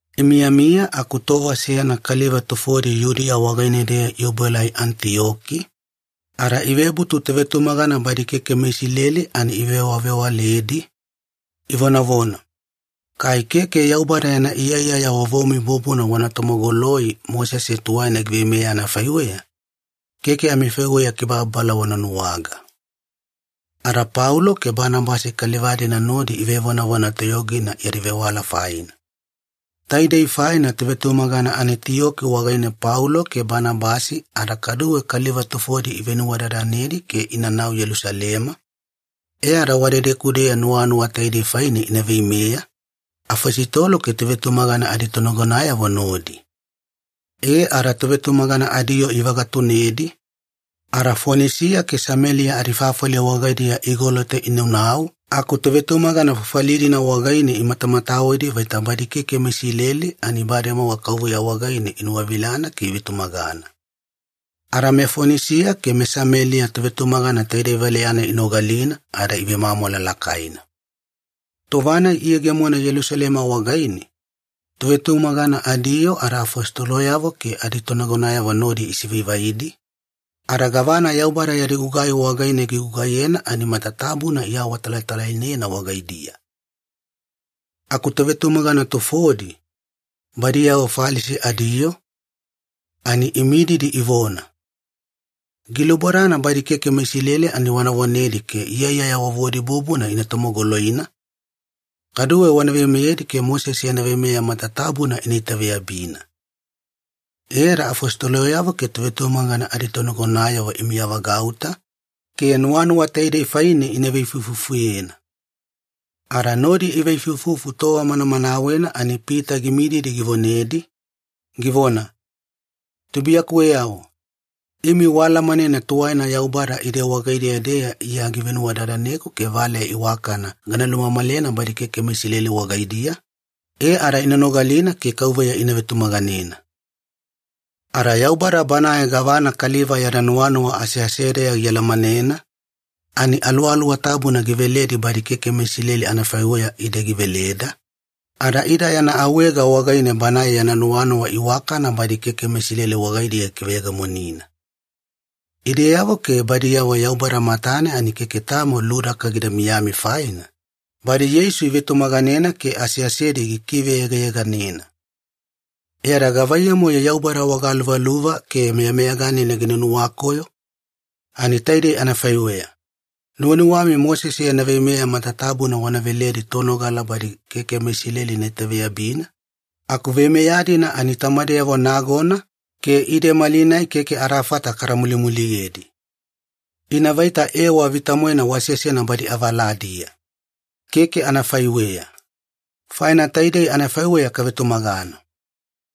Imiyamiya aku tova seyana kaliva tufodi Yudiya wagaine-deya iobuelai Anitiyoki, ada ivebutu tovetumagana badi keke meIsileli ani ivewavewaledi, ivonavona, “Kai keke Yaubada yana iyaiyaya vovomi bubuna wana tomogoloi Mosese tuwaina giveimeya anafaiweya, keke amifaiweya kibababala wana nuwaga.” Ada Paulo ke Banabasi kaliva-dina nodi ivevonavona toyogina yadi vewala faina. Taidei faina tovetumagana Anitiyoki wagaine Paulo ke Banabasi ada kaduwe kaliva tufodi ivenuwadadanedi ke inanau Yelusalema, e ada wadedeku-deya nuwanuwa taidei faine ina veimeya, afositolo ke tovetumagana aditonagonayavo nodi. E ada tovetumagana adiyoo ivagatunedi, ada Fonisiya ke Sameliya adifafali wagaidiya igolota inaunau aku tovetumagana fafali-dina wagaine imatamatawedi vaita badi keke meIsileli ani bademowa Kauveya wagaine inuwavilana ke ivetumagana. Ada meFonisiya ke meSameliya tovetumagana taidei valeya-nai inogalina ada ivemwamwala lakaina. Tova-nai iyegemona Yelusalema wagaine, tovetumagana adiyoo ada afositoloyavo ke aditonagonayavo nodi isivaivaidi, ada gavana Yaubada yadi gugai wagaine gigugaiyena ani matatabuna iawatalatalainena wagaidiya. Aku tovetumagana tufodi, badiyavo Falisi adiyoo, ani imididi ivona, “Gilubodana badi keke meIsileli ani wana vonedi ke iyaiyaya vovodi bubuna ina tomogoloina, kaduwe wana veimeyedi ke Mosese yana veimeya matatabuna ina itaveyabina.” E ada afositoloyavo ke tovetumagana aditonagonayavo imiyavagauta ke nuwanuwa taidei faine ina veifuifufuyena. Ada nodi iveifuifufu tova manamanawena ani Pita gimididi givonedi, givona, “Tubuiyakuweyavo, imi waalamanena tuwaina Yaubada ide wagaideya-deya Iya givenuwadadaneku ke valeya iwakana gana lumamalena badi keke meIsileli wagaidiya, e ada ina nogalina ke Kauveya ina vetumaganena. Ada Yaubada Banae gavana kaliva yada nuwanuwa aseasedeya gialamanena, ani Aluwaluwa Tabuna giveledi badi keke meIsileli anafaiweya ide giveleda, ada ida yana awaega wagaine Banae yana nuwanuwa iwakana badi keke meIsileli wagaidiya gikiveyegemonina. Ideyavo ke badiyavo Yaubada matane ani keke tamo ludaka gida miyami faina, badi Yeisu ivetumaganena ke aseasedi gikiveyegayeganena. E ada gavaiyamu-yo Yaubada wagaluvaluva ke meyameyaganina gina nuwakoyo? Ani taidei anafaiweya, nuwanuwami Mosese yana veimeya matatabuna wana veledi tonogala badi keke meIsileli ina itaveyabina, aku veimeya-dina ani tamadeyavo nagona ke ide malinai keke adafata kada mulimuliyedi. Ina vaita ewa vita-moena wasesena badi avaladiya. Keke anafaiweya! Faina taidei anafaiweya kavetumagana: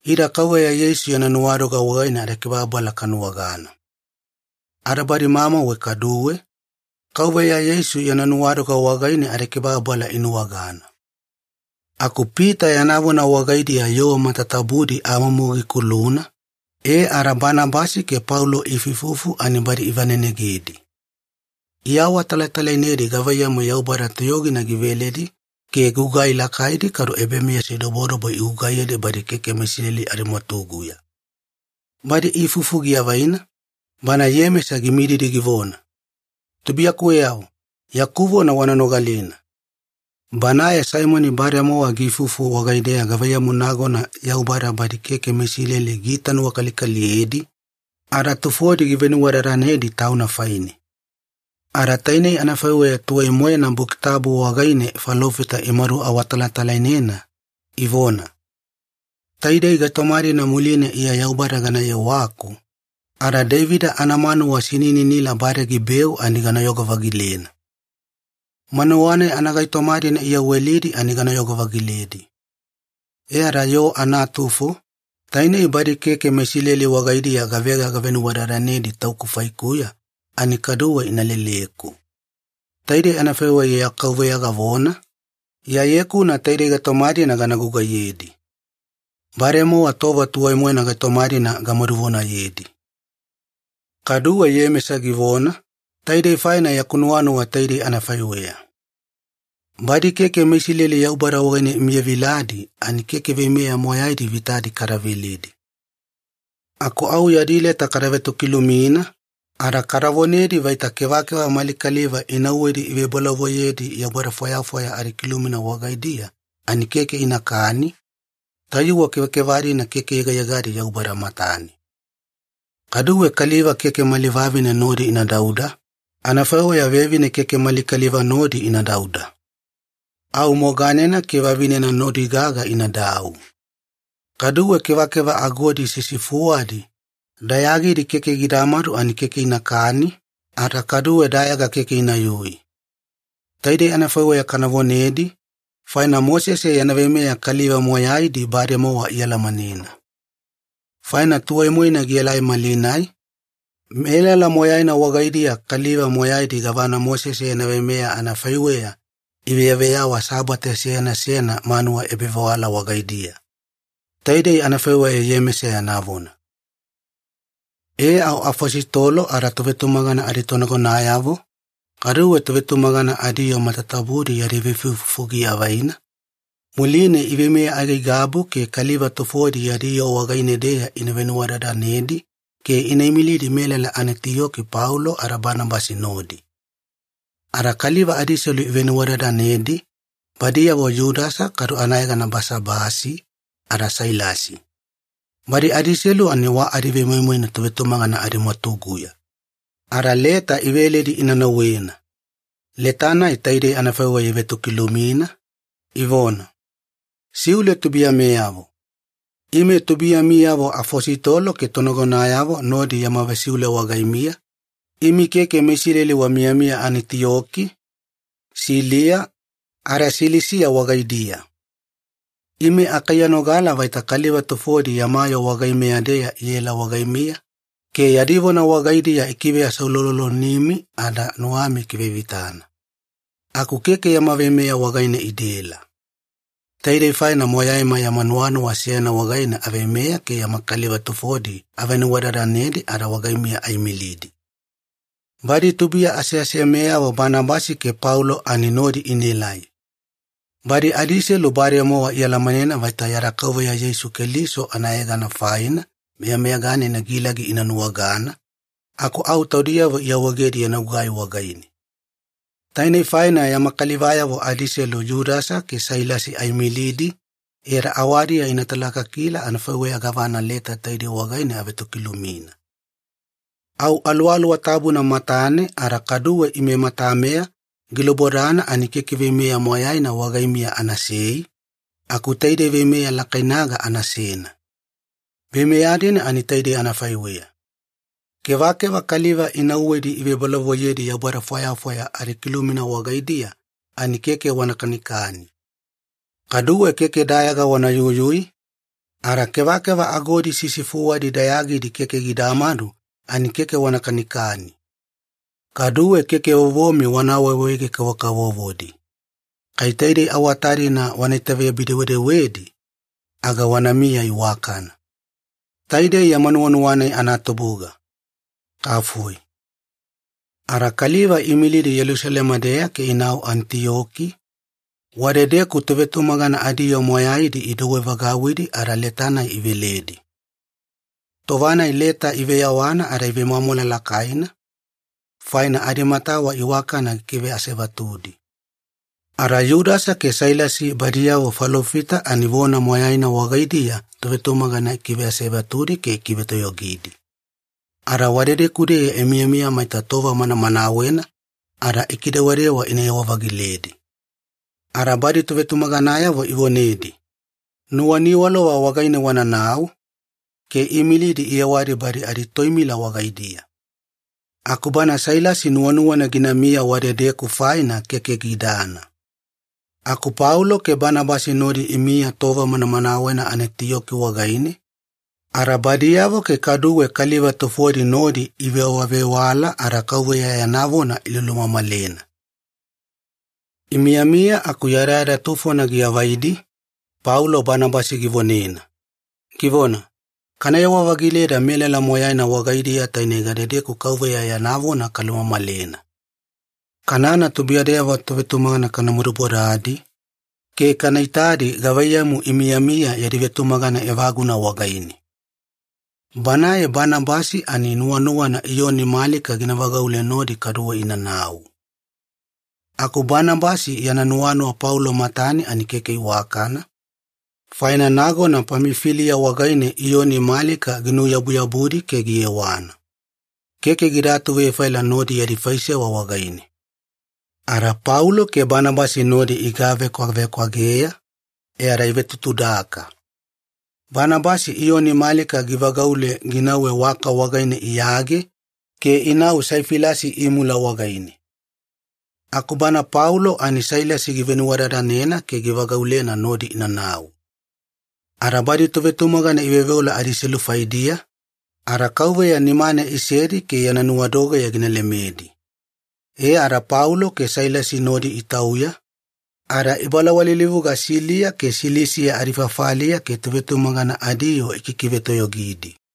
Ida Kauveya Yeisu yana nuwadoga wagaine adakibababala kanuwagana. Ada badi mamauwe kaduwe, Kauveya Yeisu yana nuwadoga wagaine adikibababala inuwagana.” Aku Pita yana vona wagaidiya yoo matatabudi amumu gikuluna, e ada Banabasi ke Paulo iifuifufu ani badi ivanenegedi. Iawatalatalainedi gavaiyamu Yaubada toyogina giveledi ke gugai lakaidi kadu ebameyasidobodobo igugaiyedi badi keke meIsileli adimwatuguya. Badi iifufu giavaina, bana Iyemesa gimididi givona, “Tubuiyakuweyavo, yaku vona wana nogalina. Banae Saimoni bademowa giifufu wagaideya gavaiyamu nagona Yaubada badi keke meIsileli giitanuwakalikaliyedi ada tufodi givenuwadadanedi Tauna faine. Ada tainei anafaiweya tuwai-moena Buki Tabu wagaine falofita imaduawatalatalainena, ivona, ‘Taidei gaitoma-dina muline Iya Yaubada gana yewaku, ada Deivida anamanuwa sinininila bade gibeu ani ganayogo-vagilena. Manuwa-nai anagaitoma-dina iyawelidi ani ganayogo-vagiledi. E ada yoo anatufo, tainei badi keke meIsileli wagaidiya gavega gavenuwadadanedi Tauku faikuya, ani kaduwe ina leleku. Taidei anafaiweya Iya KAUVEYA gavona, Iyaye-kuna taidei gaitoma-dina gana gugaiyedi. Bademowa tova tuwai-moena gaitoma-dina gamaduvonayedi.’” Kaduwe Iyemesa givona, “Taidei faina yaku nuwanuwa taidei anafaiweya. Badi keke meIsileli Yaubada wagaine imiyaviladi ani keke veimeya moyaidi vitadi kada veledi. Aku au yadi leta kada vetokilumina, ada kada vonedi vaita kevakeva mali kaliva inauwedi ivebolavoiyedi yaubada fwayafwaya adikilumina wagaidiya ani keke inakani, tayuwe kevakeva-dina keke yegayegadi Yaubada matane. Kaduwe kaliva keke mali vavine nodi ina dauda, anafaiweya vevine keke mali kaliva nodi ina dauda. Au moganena ke vavinena nodi gaga inadau. Kaduwe kevakeva agodi sisifuwadi, dayagidi keke gidamadu ani keke inakani, ada kaduwe dayaga keke inayui. Taidei anafaiweya kana vonedi, faina Mosese yana veimeya kaliva moyaidi bademowa ialamanena. Faina tuwai-moena gielai malinai, melala moyaina wagaidiya kaliva moyaidi gavana Mosese yana veimeya anafaiweya iveyaveyawa Sabate seyana seyana manuwa ebavewala wagaidiya.” Taidei anafaiweya Iyemesa yana vona. E au afositolo ada tovetumagana aditonagonayavo, kaduwe tovetumagana adiyoo matatabudi yadi veifuifufu giavaina, muline iveimeya aigaigabu ke kaliva tufodi yadi yoo wagaine-deya ina venuwadadanedi ke ina imilidi melala Anitiyoki Paulo ada Banabasi nodi. Ada kaliva adiselu ivenuwadadanedi, badiyavo Yudasa kadu anayegana Basabasi, ada Sailasi. Badi adiselu ani wa adivemoimoina tovetumagana adimwatuguya. Ada leta iveledi ina nauwena. Leta-nai taidei anafaiweya ivetokilumina, ivona, “Siule tubuiyameyavo. Ime tubuiyamiyavo afositolo ke tonagonayavo nodi yama vesiule wagaimiya, imi keke meIsileli wamiyamiya Anitiyoki, Siliya, ada Silisiya wagaidiya. Ime akaiyanogala vaita kaliva tufodi yama yoo wagaimeya-deya iela wagaimiya ke yadi vona wagaidiya ikiveaseuloulolomi ada nuwami ikivevitana. Aku keke yama veimeya wagaine idaela. Taidei faina moyaima yama nuwanuwa seyana wagaine aveimeya ke yama kaliva tufodi avenuwadadanedi ada wagaimiya aimilidi. Badi tubuiya aseasemeyavo Banabasi ke Paulo ani nodi inaelai. Badi adiselu bademowa ialamanena vaita yada Kauveya Yeisu Keliso anayegana faina meyameyaganina gilagi ina nuwagana, aku au taudiyavo iawaegedi yana gugai wagaine. Tainei faina yama kalivayavo adiselu Yudasa ke Sailasi aimilidi e ada awadiya ina talakakila anafaiweya gavana leta taidei wagaine avetokilumina. Au Aluwaluwa Tabuna matane ada kaduwe ime matameya gilubodana ani keke veimeya moyaina wagaimiya anasei, aku taidei veimeya lakainaga anasena. Veimeya-dina ani taidei anafaiweya. Kevakeva kaliva inauwedi ivebolavoiyedi yaubada fwayafwaya adikilumina wagaidiya ani keke wana kanikani. Kaduwe keke dayaga wana yuyui, ada kevakeva agodi sisifuwadi dayagidi keke gidamadu ani keke wana kanikani. Kaduwe keke vovomi wana awaawaege-kavokavovodi. Kai taidei awata-dina wana itaveyabi-dewedewedi, aga wanamiya iwakana. Taidei yama nuwanuwa-nai anatubuga. Kafoi.” Ada kaliva iimilidi Yelusalema-deya ke inau Anitiyoki, wadedeku tovetumagana adiyoo moyaidi idouwevagauwidi ada leta-nai iveledi. Tova-nai leta iveyawana ada ivemwamwala lakaina, faina adimatawa iwakana gikiveasevatudi. Ada Yudasa ke Sailasi badiyavo falofita ani vona moyaina wagaidiya tovetumagana ikiveasevatudi ke ikivetoyogidi. Ada wadedeku-deya imiyamiya maita tova manamanawena, ada ikidewadewa inayewa-vagiledi. Ada badi tovetumaganayavo ivonedi, “Nuwaniwalova wagaine wananau,” ke iimilidi iyewadi badi aditoimila wagaidiya. Aku bana Sailasi nuwanuwana ginamiya wadedeku faina keke gidana. Aku Paulo ke Banabasi nodi imiya tova manamanawena Anitiyoki wagaine, ada badiyavo ke kaduwe kaliva tufodi nodi ivewavewala ada Kauveya yana vona ilulumamalena. Imiyamiya aku yadayada tufona giavaidi, Paulo Banabasi givonena, givona, “Kanayewa-vagileda melala moyaina wagaidiya taine gadedeku Kauveya yana vona kalumamalena. Kanana tubuiyadeyavo tovetumagana kana madubodadi, ke kana itadi gavaiyamu imiyamiya yadi vetumagana evaguna wagaine.” Banae Banabasi ani nuwanuwana Iyoni Malika gina vagaule nodi kaduwe inanau. Aku Banabasi yana nuwanuwa Paulo matane ani keke iwakana, faina nagona Pamifiliya wagaine Iyoni Malika ginuyabuyabudi ke giyewana. Keke gida atuvefaila nodi yadi faisewa wagaine. Ada Paulo ke Banabasi nodi igavekwavekwageya, e ada ivetutudaka. Banabasi Iyoni Malika givagaule ginauwe waka wagaine iyage ke inau Saifilasi imula wagaine. Aku bana Paulo ani Sailasi givenuwadadanena ke givagaulena nodi inanau. Ada badi tovetumagana iveoveola adiselu faidiya, ada Kauveya nimane isedi ke yana nuwadogeya gina lemedi. E ada Paulo ke Sailasi nodi itauya, ada ibalawalilivuga Siliya ke Silisiya adifafaliya ke tovetumagana adiyoo ikikivetoyogidi.